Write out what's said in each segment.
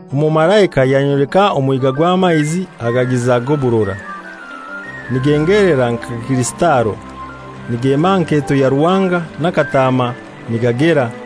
Omumalaika yanyoleka omwiga gw'amaizi agagiza g'oburora, nigengelera nka kirisitalo, nigema aha nketo ya Ruhanga na Kataama nigagera,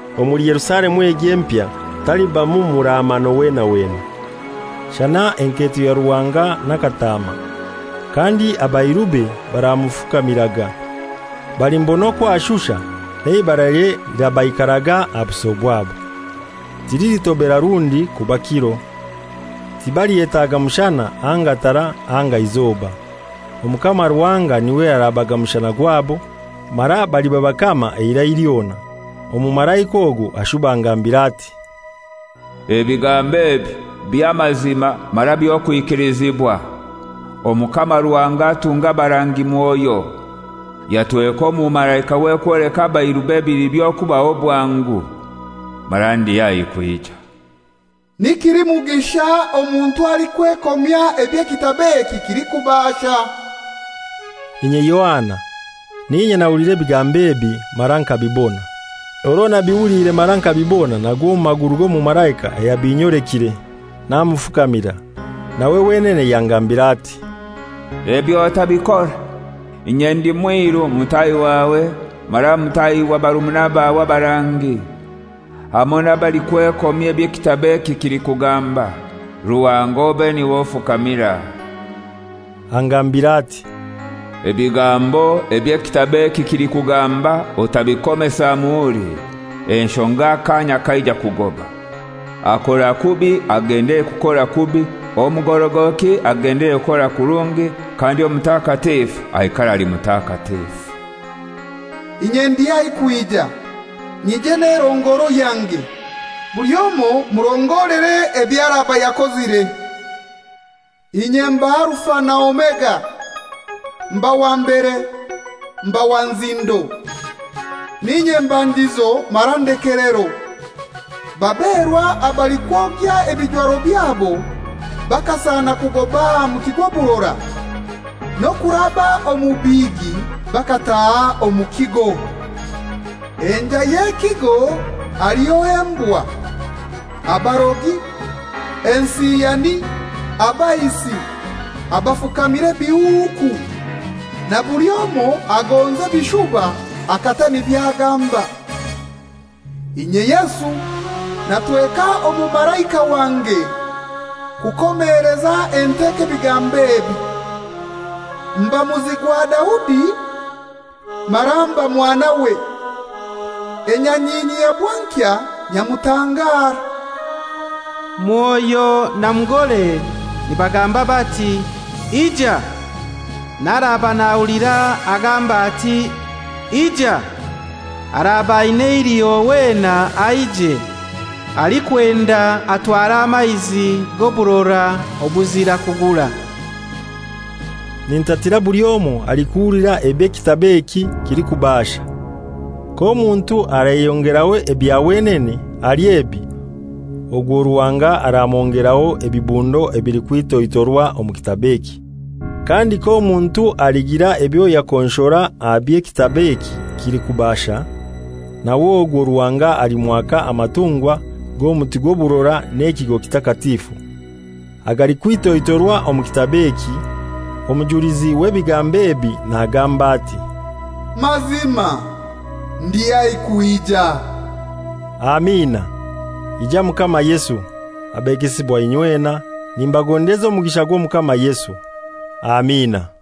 Omuli Yerusalemu egyo empya talibamu muraamano wena wena, shana enketo ya Ruhanga na Kataama. Kandi abairube baramufukamiraga. Balimubona okw'ashusha n'eibaralye lirabaikaraga aha buso bwabo. Tililitobera rundi kuba kiro. Tibalyetaaga mushana anga tara anga izoba. Omukama Ruhanga n'iwe arabaga mushana gwabo, mara baliba bakama eirai lyona. Omumalaika ogwo ashuba angambira ati, «Ebigambo ebi by'amazima mara by'okwikilizibwa. Omukama Ruhanga atunga abarangi Mwoyo, yatweka omumalaikawe kwoleka abairube ebili byokubaho bwangu. Mara ndi haihi kwija.» Ni kilimugisha omuntu alikwekomya eby'ekitabo eki kilikubaasha. Inye Yohana, n'inye nahulire ebigambo ebi mara nkabibona. Orwo nabihuliire mara nkabibona nagwa omu maguru g'omumalaika ayabinyolekire, namufukamira. Nawe wenene yangambira ati, «Ebyo otabikora! Inye ndi mwiru mutaahi wawe mara mutaahi wa barumuna bawe abarangi, hamoi n'abalikwekomya eby'ekitabo eki kilikugamba. Ruhanga obe n'iwe ofukamira.» Angambira ati, «Ebigambo eby'ekitabo eki kilikugamba otabikomesa muhuri, enshonga akaanya kaija kugoba. Akora kubi agendelere kukora kubi, omugorogoki agendelere kukora kurungi, kandi omutakatifu aikare ali mutakatifu. «Inye ndi haihi kwija, nyije n'erongoro yange, buli omoi murongore eby'araba yakozire. Inye mba Alufa na Omega, mba wa mbere, mba wa nzindo, n'inye mbandizo mara ndekelero.» Baberwa abalikwogya ebijwaro byabo bakasana kugoba aha muti gw'oburora, n'okuraba omu bihigi bakataaha omu kigo. Enjai y'ekigo haliho embwa, abarogi, ensiyani, abaisi, abafukamira ebihuuku, na buli omoi agonza ebishuba akata nibyo agamba. «Inye Yesu natweka omumalaika wange kukomeleza enteko ebigambo ebi. Mba muzi gwa Daudi mara mba mwanawe, enyanyinyi ya bwankya nyamutangara.» Mwoyo na Mugore nibagamba bati, «Ija!» N'araaba nahulira agambe ati, «Ija!» Araaba aina eiliho wena aije. Alikwenda atware amaizi g'oburora obuzira kugura. Nintatira buli omoi alikuhulira eby'ekitabo eki kilikubaasha. K'omuntu alayongeraho ebya wenene ahali ebi, ogwo Ruhanga aramwongeraho ebibundo ebilikwitoitorwa omu kitabo eki. Kandi k'omuntu aligira ebyo yakonshora aha by'ekitabo eki kilikubasha, nawe ogwo Ruhanga alimwaka amatungwa g'omuti gw'oburora n'ekigo kitakatifu, agalikwitoitorwa omu kitabo eki. Omujulizi w'ebigambo ebi nagamba ati, «Mazima ndi haihi kwija.» Amina. Ija Mukama Yesu! Abegesibwa inywena, nimbagondeza omugisha gw'Omukama Yesu. Amina